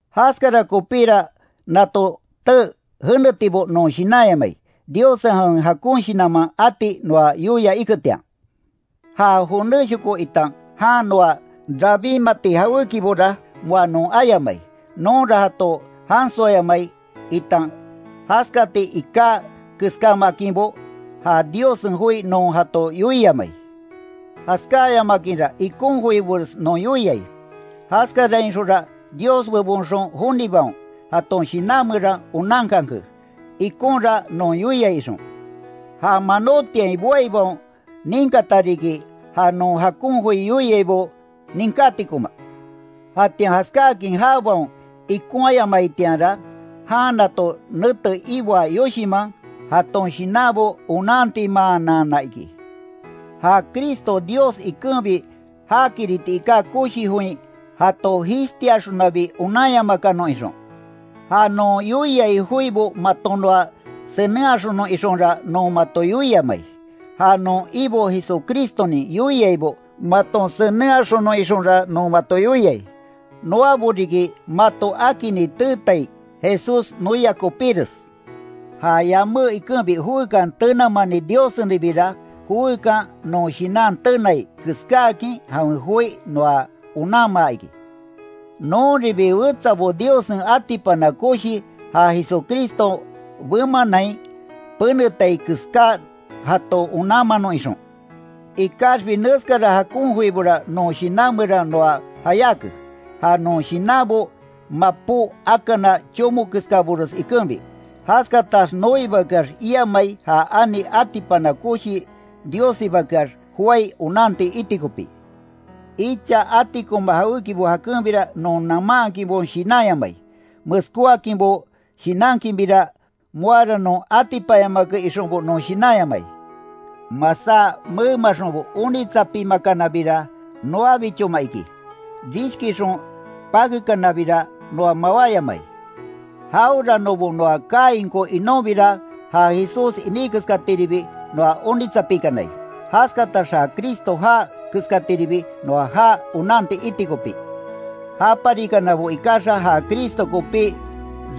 Jaskara kopíra nato tee jenetibo non shinanyamai, Diossen jawen jakon shinanman ati noa yoia iketian. Ja jonéshoko itan jan noa rabinmati jawékibora moa non ayamai; nonra jato jansoayamai itan jaskati iká keskámaakinbo, ja Diossen joi non jato yoiamai. Jaskáyamakinra ikon joibores non yoiai, jaskarainxonra Dios bebonxon jonibaon, jaton shinan meran onankanke, ikonra non yoiai ixon. Ja manotiain boaibaon ninkata riki, ja non jakon joi yoiaibo ninkátikoma. Jatian jaskáakin jabaon ikonhayamaitianra, jan nato nete iboa yoshinman, jaton shinanbo onantimaanana iki, ja Cristo Dios ikenbi jakiriti iká koshi join jato jishtiaxonabi onanyamakanon ixon. Ja non yoiai joibo maton noa senenhaxonon ixonra non mato yoiamai; ja non Ibo Jesucristonin yoiaibo maton senenhaxonon ixonra non mato yoiai. Noabo riki mato akinni teetaibo Jesús noia kopíres. Ja yamé ikenbi joekan tenamani Diossenribira, joekan non shinan tenai keskáakin jawen joi noa onanmaa iki. Nonribi wetsabo Diossen atipana koshi ja Jesucriston bemanain penetai keská jato onanmanon ixon. Ikaxbi neskara jakon joibora non shinan meran noa jayáke, ja non shinanbo mapó akana chomo keskabores ikenbi. Jaskatax noibakeax iamai ja ani atipana koshi Diossibakeax joái onanti iti kopí. Icha atikoma jawékibo jakenbira non namaankinbo shinanyamai; meskóakinbo shinankinbira moara non atipanyamake ixonbo non shinanyamai, masá memaxonbo onitsapimakanabira, noabichoma iki, rishkixon pakekanabira noa mawáyamai. Jaweranobo noa kainko inonbira ja Jesús iní keskatiribi noa onitsapikanai, jaskatax ja Cristo jaa keskatiribi noa jaa onanti iti kopí. Japarikanabo ikaxa ja Cristo kopi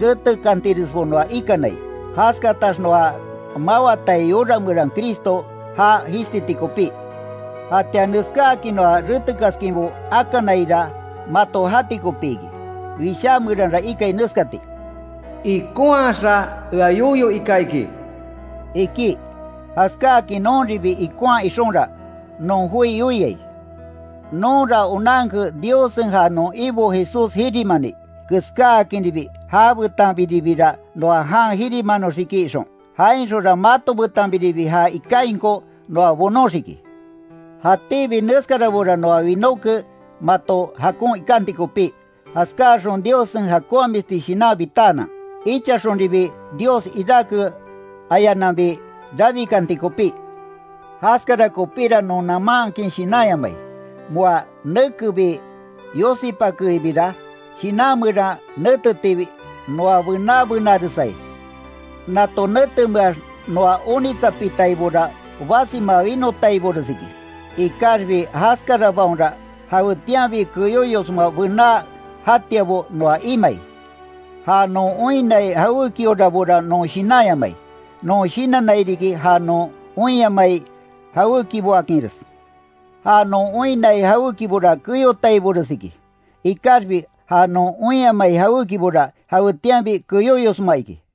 retekantiresbo noa ikanai, jaskatax noa mawatai yora meran Cristo jaa jishtiti kopí. Jatian neskáakin noa retekaskinbo akanaira, mato jati kopi iki. Wishá meranra ikai neskati: “Ikonhaxa ea yoyo ika iki”, iki. Jaskáakin nonribi ikonha ixonra, non joi yoiai. Nonra onanke Diossen ja non Ibo Jesús jirimani, keskáakinribi já betanbiribira noa jan jirimanoxiki ixon, jainxonra mato betanbiribi ja ikainko noa bonóxiki. Jatíbi neskarabora noa winóke mato jakon ikanti kopí, jaskaxon Diossen jakonhamisti shinan bitaanan, ichaxonribi Dios iráke ayananbi rabikanti kopí. Jaskara kopíra non namaankin shinanyamai, moa nekebi yosipakeibira shinan meran netetiibi noa bená benaresai. Nato netemeax noa onitsapitaibora basima winotaibores iki, ikaxbi jaskarabaonra jawetianbi keyoyosma bená jatiabo noa imai. Ja non oinnai jawékiorabora non shinanyamai, non shinannai riki ja non oinyamai jawékiboakinres, ja non oinnai jawékibora keyotaibores iki, ikaxbi ja non oinyamai jawékibora jawetianbi keyóyosma iki.